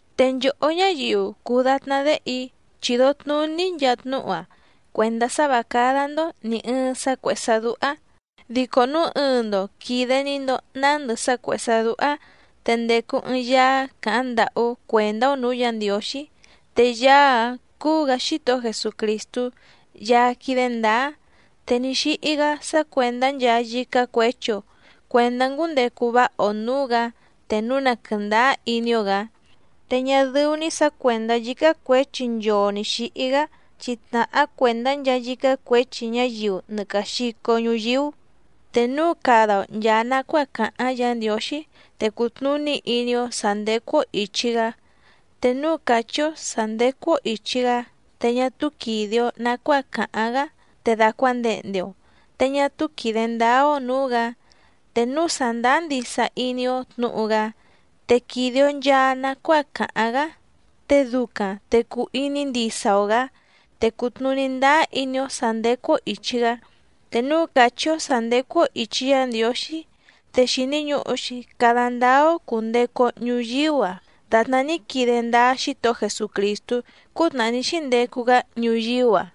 Te nchòhó ñáyiu cùu datná déhe‑í, chìdo tnuní‑í nchaa tnúhu‑a cuèndá sá vǎ cádá‑ndó nì ɨɨⁿ sá cuèhé sá dúhá. Dico núu ɨɨⁿ‑ndo quìde‑ni‑ndo nándɨ sá cuèhé sá dúhá, te ndècu ɨɨⁿ Yaá càháⁿ ndàhú cuèndá‑ó nǔú Yǎ Ndiǒxí. Te Yaá‑áⁿ cúú‑gǎ Xítohó Jesucrìstú Yaá quídé ndǎá. Te ní xíhí‑gá sá cuèndá nchaa yícá cuěchi‑o cuèndá ngúndecu váha‑o nǔú‑gǎ te núu na quɨ̀ndáá iní‑ó‑gǎ. Te ñá dɨ́ú‑ní sǎ cuèndá yícá cuěchi nchoo nǐ xíhí‑gá, chi tnàhá cuèndá nchaa yícá cuěchi ñáyiu nɨ càa xico ñuyíú. Te núu cada‑o nchàa nacuáa càháⁿ Yǎ Ndiǒxí, te cutnùní iní‑ó sǎ ndécú‑ó ìchi‑gá. Te núu càchí‑ó sǎ ndécú‑ó ìchi‑gá te ñá túú quìde‑o nacuáa càháⁿ‑gá, te dàcuandehnde‑o, te ñá túú quìde ndáá‑ó nǔú‑gǎ. Te núu sàndáá ndisa iní‑ó tnǔhu‑gá, te quìde‑o nchaa nacuáa càháⁿ‑gá, te ducaⁿ te cùu iní ndisa‑o‑gǎ, te cùtnuní ndáá iní‑ó sǎ ndécú‑ó ìchi‑gá. Te núu càchí‑ó sǎ ndécú‑ó ìchi Yá Ndiǒxí, te xìni ñuhu‑xi cada ndáá‑ó cùndecu‑o ñuyíú‑a dàtná ní quide ndáá Xítohó Jesucrìstú cútnàhá ní xíndecu‑gá ñuyíú‑a.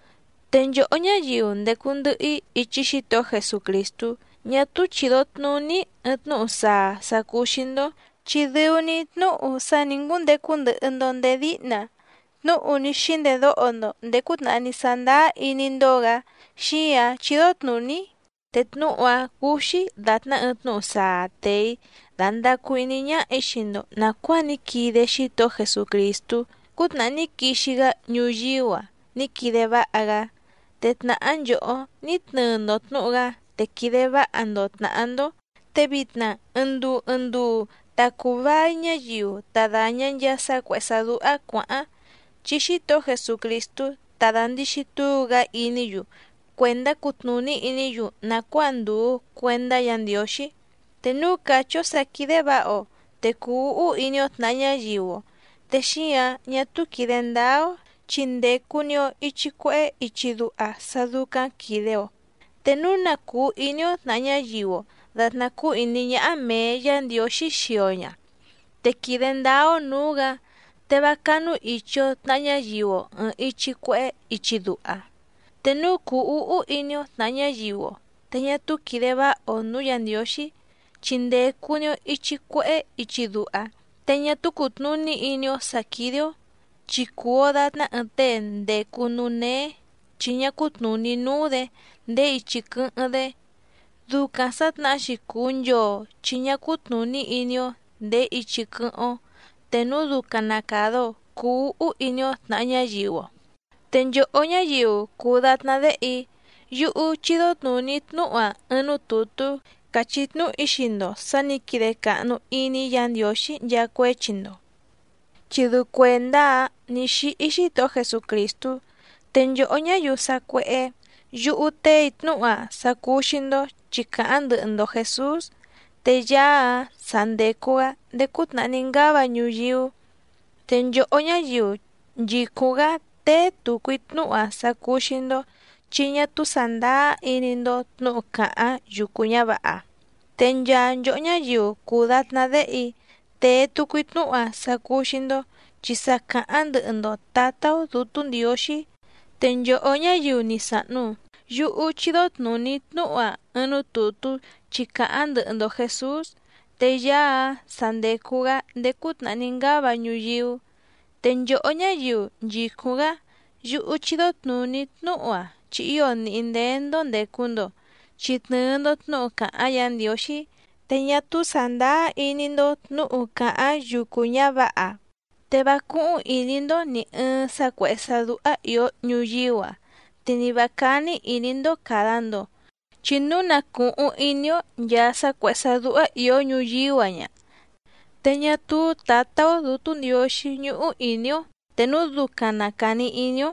Te nchòhó ñáyiu ndècu ndɨhɨ‑í ichi Xítohó Jesucrìstú, ñá túú chìdo tnuní‑í ɨɨⁿ tnúhu saa sà cúú‑xí‑ndó, chi dɨu‑ni tnúhu sá nǐ ngúndecu ndɨhɨ‑ndo nděé díhna, tnúhu ní xíndedóho‑ndo nděé cútnàhá ní sándáá iní‑ndó‑gǎ, xíǎⁿ chídó tnùní‑í. Te tnúhu‑a cùu‑xi datná ɨɨⁿ tnúhu saa tèe‑í dándàcu iní ñáhà‑í xii‑ndo nàcuáa ní quide Xítohó Jesucrìstú cútnàhá ní quixi‑gá ñuyíú‑a ní quide váha‑gá, te tnàhá nchòhó ní tnɨɨ‑ndo tnǔhu‑gá te quìde váha‑ndo tnàhá‑ndó. Te vitna ɨɨⁿ nduu ɨɨⁿ nduu ta cùu vai ñáyiu ta dàña nchaa sá cuèhé sá dúhá cuǎháⁿ, chi Xítohó Jesucrìstú tá dàndixi túu‑gá iní‑yu cuèndá cutnùní iní‑yu nàcuáa ndùu cuendá Yǎ Ndiǒxí. Te núu càchí‑ó sǎ quídé vǎha‑o, te cùu úhú iní‑ó tnàha ñáyiu‑o, te xíǎⁿ ñá túú quìde ndáá‑ó, chi ndècu‑ni‑o ichi cuehé ichi duha sá dúcáⁿ quìde‑o. Te núu na cùu iní‑ó tnàha ñáyiu‑o dàtná cúú ìní ñáhá mèe Yá Ndiǒxí xii‑o ña, te quìde ndáá‑ó nǔú‑gǎ, te vá cánúìchi‑o tnaha ñáyiu‑o ɨ̀ɨⁿ ichi cuehé ichi duha. Te núu cùu úhú iní‑ó tnàha ñáyiu‑o, te ñá túú quìde váha‑o nǔú Yǎ Ndiǒxí, chi ndècu‑ni‑o ichi cuehé ichi duha, te ñá túú cùtnuní iní‑ó sǎ quídé‑ó. Chi cùu‑o datná ɨɨⁿ tée ndècu núú néé chi ñá cútnùní núú‑dě ndèé ichi quɨ́hɨ́ⁿ‑dé. Ducaⁿ sǎtnahá‑xi cùu nchoo chi ñá cútnùní iní‑ó ndèé ichi quɨ́hɨ́ⁿ‑ó te núu ducaⁿ na càda‑o cuu úhú iní‑ó tnàha ñáyiu‑o. Te nchòhó ñáyiu cùu datná déhe‑í, yúhú chídó tnùní‑í tnúhu‑a ɨɨⁿ núú tùtú càchí tnúhu‑í xii‑ndo sǎ nǐ quide càhnu iní Yǎ Ndiǒxí nchaa cuéchi‑ndo, chi dɨu cuèndá‑áⁿ nǐ xíhí Xítohó Jesucrìstú. Te nchòhó ñáyiu sacuéhé, yúhú téè‑í tnúhu‑a sá cúú‑xí‑ndó chi càháⁿ ndɨhɨ‑ndo Jèsús, te Yaá‑áⁿ sa ndècu‑gá ndéé cútnàhá ní ngáva ñuyíú. Te nchòhó ñáyiu nchìcúⁿ‑gá téé tùcu‑í tnúhu‑a sá cúú‑xí‑ndó chi ñá túú sàndáá iní‑ndó tnǔhu càháⁿ yucu ñǎvǎha. Te nchaa nchòhó ñáyiu cùu datná déhe‑í, tèe tucu‑í tnúhu‑a sá cúú‑xí‑ndó, chi sa càháⁿ ndɨhɨ‑ndo Tǎtá‑ó Dǔtú Ndiǒxí. Te nchòhó ñáyiu ni sàhnu, yúhú chídó tnùní‑í tnúhu‑a ɨɨⁿ núú tùtú chi càháⁿ ndɨhɨ‑ndo Jèsús, te Yaá‑áⁿ sa ndècu‑gá ndéé cútnàhá ní ngáva ñuyíú. Te nchòhó ñáyiu nchìcúⁿ‑gá, yúhú chídó tnùní‑í tnúhu‑a chi ío nìhí ndéé‑ndó ndècu‑ndo, chi tnɨ̀ɨ‑ndo tnúhu càháⁿ Yǎ Ndiǒxí. Te ñá túú sàndáá iní‑ndó tnǔhu càháⁿ yucu ñǎvǎha. Te vá cúhúⁿ ìní‑ndó nì ɨɨⁿ sá cuèhé sá dúhá ìó ñuyíú‑a, te ni vǎ cání ìní‑ndó càda‑ndo. Chi núu na cùhuⁿ iní‑ó nchàa sá cuèhé sá dúhá ìó ñuyíú‑a ña, te ñá túú Tǎtá‑ó Dǔtú Ndiǒxí ñúhú ìní‑ó te núu ducaⁿ na càni iní‑ó.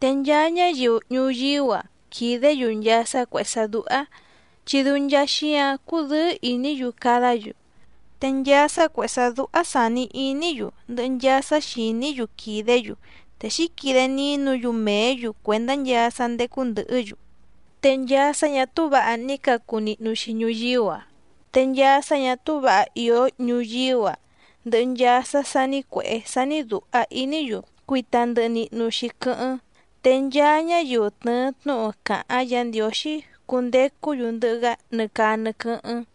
Te nchaa ñáyiu ñuyíú‑a quìdé‑yu nchaa sá cuèhé sá dúhá, chi dɨu nchaa xíǎⁿ cúdɨ̌ɨ́ ìní‑yu cadá‑yu. Te nchaa sá cuèhé sá dúhá sàni iní‑yu, ndɨhɨ nchaa sá xìní‑yu quìdé‑yu. Te xǐquide nínu‑yu mèé‑yu cuèndá nchaa sá ndécú ndɨ̀hɨ́‑yu. Te nchaa sá ñà túú vǎha ní cacu nihnu‑xi ñuyíú‑a. Te nchaa sá ñà túú vǎha ìó ñuyíú‑a, ndɨhɨ nchaa sá sání cuèhé sání dùha iní‑yu cuita ndɨhɨ nihnu‑xi quɨ́hɨ́ⁿ. Te nchaa ñáyiu tnɨ̀ɨ tnúhu càháⁿ Yǎ Ndiǒxí cundecú‑yu ndɨhɨ‑gá nɨ caa nɨ quɨ́hɨ́ⁿ.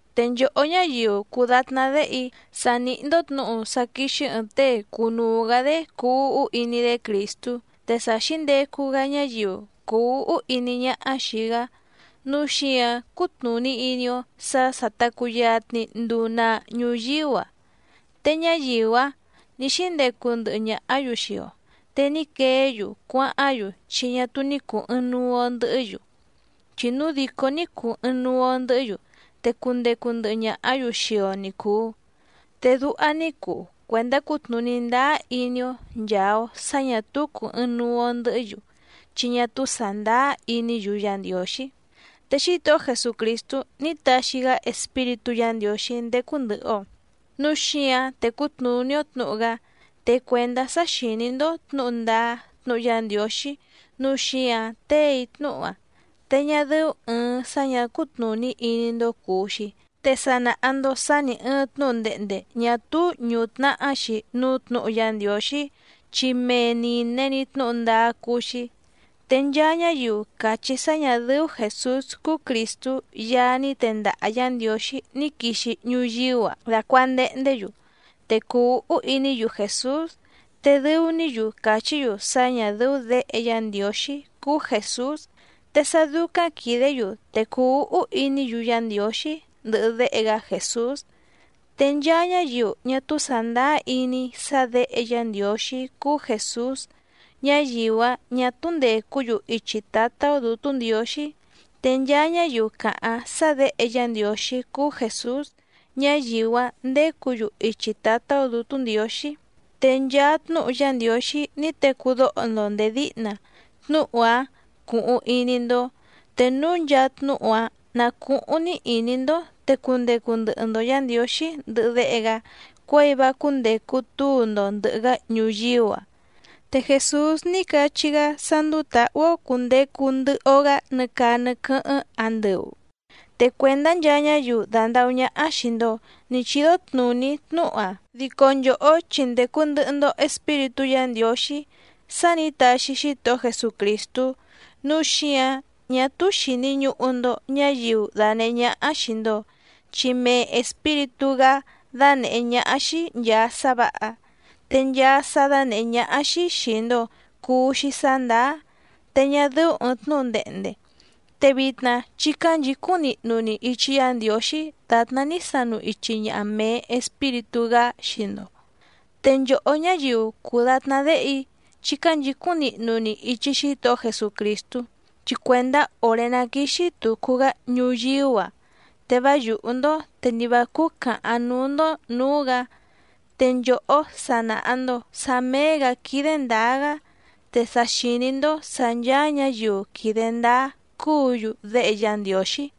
Te nchòhó ñáyiu cùu datná déhe‑í, sa nìhí‑ndó tnǔhu sá quíxí ɨ̀ɨⁿ tée cunuu‑gǎ‑dé cuu úhú iní‑dé Crìstú. Te sa xǐndecu‑gá ñáyiu cùu úhú iní ñáhá xìi‑gá, núu xíǎⁿ cútnùní iní‑ó sǎ sà ta cuyatni nduu naa ñuyíú‑a. Te ñáyiu‑áⁿ nǐ xíndecu ndɨhɨ ñàhá‑yu xii‑o, te ní queé‑yu cuáháⁿ‑yu chi ñá túú ní cùu ɨɨⁿnuu‑o ndɨhɨ́‑yu. Chi núu dìcó ní cùu ɨɨⁿnuu‑o ndɨhɨ́‑yu te cundecu ndɨhɨ ñàhá‑yu xii‑o ni cùu. Te duha ní cuu cuèndá cutnùní ndáá iní‑ó nchàa‑o sá ñà túú cùu ɨɨⁿnuu‑o ndɨhɨ́‑yu, chi ñá túú sàndáá iní‑yu Yá Ndiǒxí. Te Xítohó Jesucrìstú ní taxi‑gá Espíritú Yǎ Ndiǒxí ndécú ndɨ̀hɨ‑o, núu xíǎⁿ tècú tnùní‑ó tnǔhu‑gá. Te cuèndá sá xìní‑ndó tnǔhu ndáá tnúhu Yá Ndiǒxí nǔu xíǎⁿ téè‑í tnúhu‑a, te ñá dɨ́ú ɨ̀ɨⁿ sá ñǎ cútnùní iní‑ndó cùu‑xi. Te sa nàha‑ndo sá nì ɨɨⁿ tnúhu ndehnde ñà túú ñùtnahá‑xi núú tnǔhu Yá Ndiǒxí, chi mee nìne‑ni tnúhu ndáá cúú‑xí. Te nchaa ñáyiu càchí sá ñà dɨ́ú Jèsús cúú Crìstú Yaá ní tendaha Yǎ Ndiǒxí ní quixi ñuyíú‑a dàcuandehndé‑yu, te cùu úhú iní‑yu Jèsús. Te dɨu‑ní‑yu càchí‑yu sá ñà dɨ́ú Děhe Yá Ndiǒxí cúú Jèsús, te sá dúcáⁿ quìdé‑yu te cùu úhú iní‑yu Yá Ndiǒxí ndɨhɨ Déhe‑gá Jèsús. Te nchaa ñáyiu ñá túú sàndáá iní sá Děhe Yá Ndiǒxí cúú Jèsús, ñáyiu‑áⁿ ñà túú ndècú‑yu ichi Tǎtá‑ó Dǔtú Ndiǒxí. Te nchaa ñáyiu càháⁿ sá Děhe Yá Ndiǒxí cúú Jèsús, ñáyiu‑áⁿ ndécǔ‑yu ichi Tǎtá‑ó Dǔtú Ndiǒxí. Te nchaa tnúhu Yá Ndiǒxí ní tecú dóho‑ndo ndèé díhna, tnúhu‑áⁿ cuhuⁿ iní‑ndó. Te núu nchaa tnúhu‑áⁿ ná cùhuⁿ‑ni iní‑ndó, te cundecu ndɨhɨ‑ndo Yǎ Ndiǒxí ndɨhɨ Déhe‑gá cuěi vá cúndècu túu‑ndo ndɨ̀hɨ‑gá ñuyíú‑a. Te Jèsús ní cachí‑gá sá ndúú tǎhú‑ó cùndecu ndɨhɨ‑o‑gá nɨ caa nɨ quɨ́hɨ́ⁿ andɨu. Te cuèndá nchaa ñáyiu dàndahú ñáhá xìi‑ndo ní chídó tnùní‑í tnúhu‑a, dico nchòhó chi ndècu ndɨhɨ‑ndo Espíritú Yǎ Ndiǒxí sá nǐ taxi Xítohó Jesucrìstú. Núu xíǎⁿ ñá túú xìni ñuhu‑ndo ñáyiu danèhé ñáhá xìi‑ndo, chi mee Espíritú‑gá dánèhé ñáhá‑xí nchàa sá vǎha. Te nchaa sá dánèhé ñáhá‑xí xìi‑ndo cuu‑xi sá ndàá, te ñá dɨ́ú ɨ̀ɨⁿ tnúhu ndehnde. Te vitna chí cánchǐcúⁿ nihnu‑ni ichi Yá Ndiǒxí dàtná ní sanu ichi ñaha mèe Espíritú‑gá xii‑ndo. Te nchòhó ñáyiu cùu datná déhe‑í, chí cánchǐcúⁿ nihnu‑ni ichi Xítohó Jesucrìstú, chi cuèndá òré ná quíxí tùcu‑gá ñuyíú‑a te vá yùhú‑ndó te nì vá cúú càhaⁿ núú‑ndó nǔú‑gǎ. Te nchòhó sa nàha‑ndo sá méé‑gǎ quídé ndǎá‑gá, te sa xìní‑ndó sǎ ncháá ñǎyiu quìde ndáá cúǔ‑yu déhe Yá Ndiǒxí.